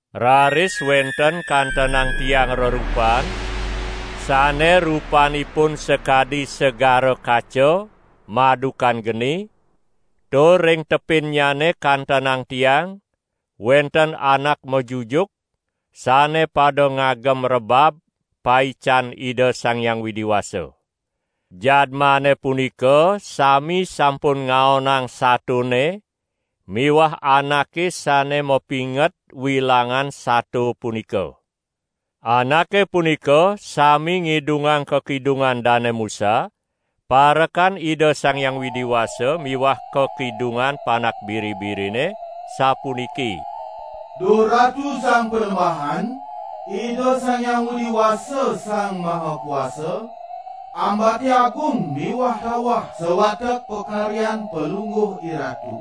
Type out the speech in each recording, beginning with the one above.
Raris wenten kantenang tiang rerupan sane rupanipun sakadi segara kaca madukan geni, tur ring tepinnya kantenang tiang wenten anak majujuk sane pada ngagem rebab paican Ida Sang Hyang Widi Wasa. Jadmane punika sami sampun ngaonang satone miwah anake sane mapinget wilangan sato punika. Anake punika sami ngidungang kakidungan Dane Musa, parekan Ida Sang Hyang Widi Wasa miwah kakidungan Panak Biri-birine, sapuniki: "Duh Ratu Sang Panembahan, Ida Sang Hyang Widi Wasa, Sang Maha Kuasa, ambate agung miwah tawah sawatek pakaryan Palungguh IRatu.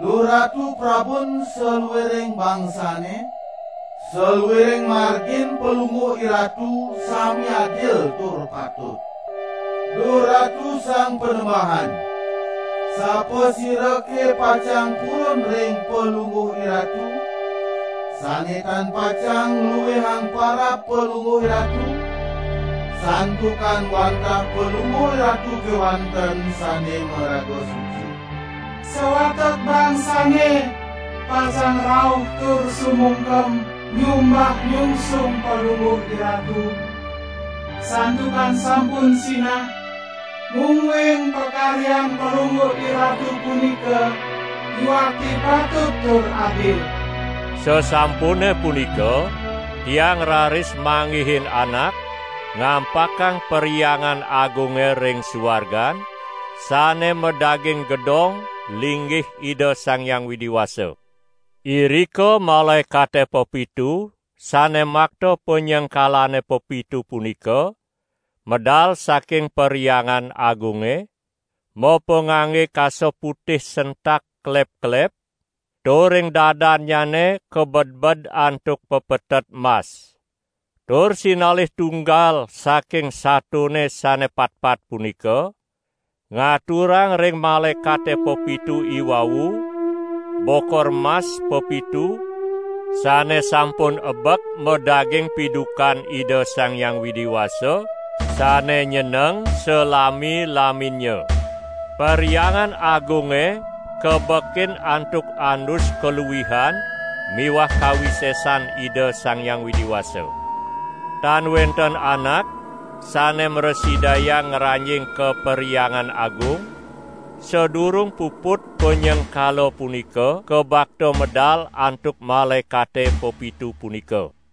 Duh Ratu Prabun saluiring bangsane, saluiring margin Palungguh IRatu sami adil tur patut. Duh Ratu Sang Panembahan, sapasirake pacang purun ring Palungguh IRatu, sane tan pacang ngluihang parab Palungguh IRatu? Santukan wantah Palungguh IRatu kewanten sane maraga suci. Sawatek bangsane pacang rauh tur sumungkem nyumbah nyungsung Palungguh IRatu, santukan sampun sinah, mungguing pakaryan Palungguh IRatu punika yuakti patut tur adil." Sasampune punika tiang raris manggihin anak ngampakang Perhyangan Agunge ring suargan, sane madaging gedong linggih Ida Sang Hyang Widi Wasa. Irika malaekate pepitu sane makta panyengkalane pepitu punika medal saking Perhyangan Agunge, mapangangge kasa putih sentak kelep-kelep, tur ring dadannyane kabedbed antuk pepetet mas. Tur sinalih tunggal saking satone sane patpat punika ngaturang ring malaekate pepitu iwau bokor mas pepitu sane sampun ebek madaging pidukan Ida Sang Hyang Widi Wasa sane nyeneng salami-laminnya. Perhyangan Agunge kabekin antuk andus kaluihan miwah kawisesan Ida Sang Hyang Widi Wasa. Tan wenten anak sane mrasidayang ngranjing ka Perhyangan Agung, sadurung puput panyengkala punika kabakta medal antuk malaekate pepitu punika.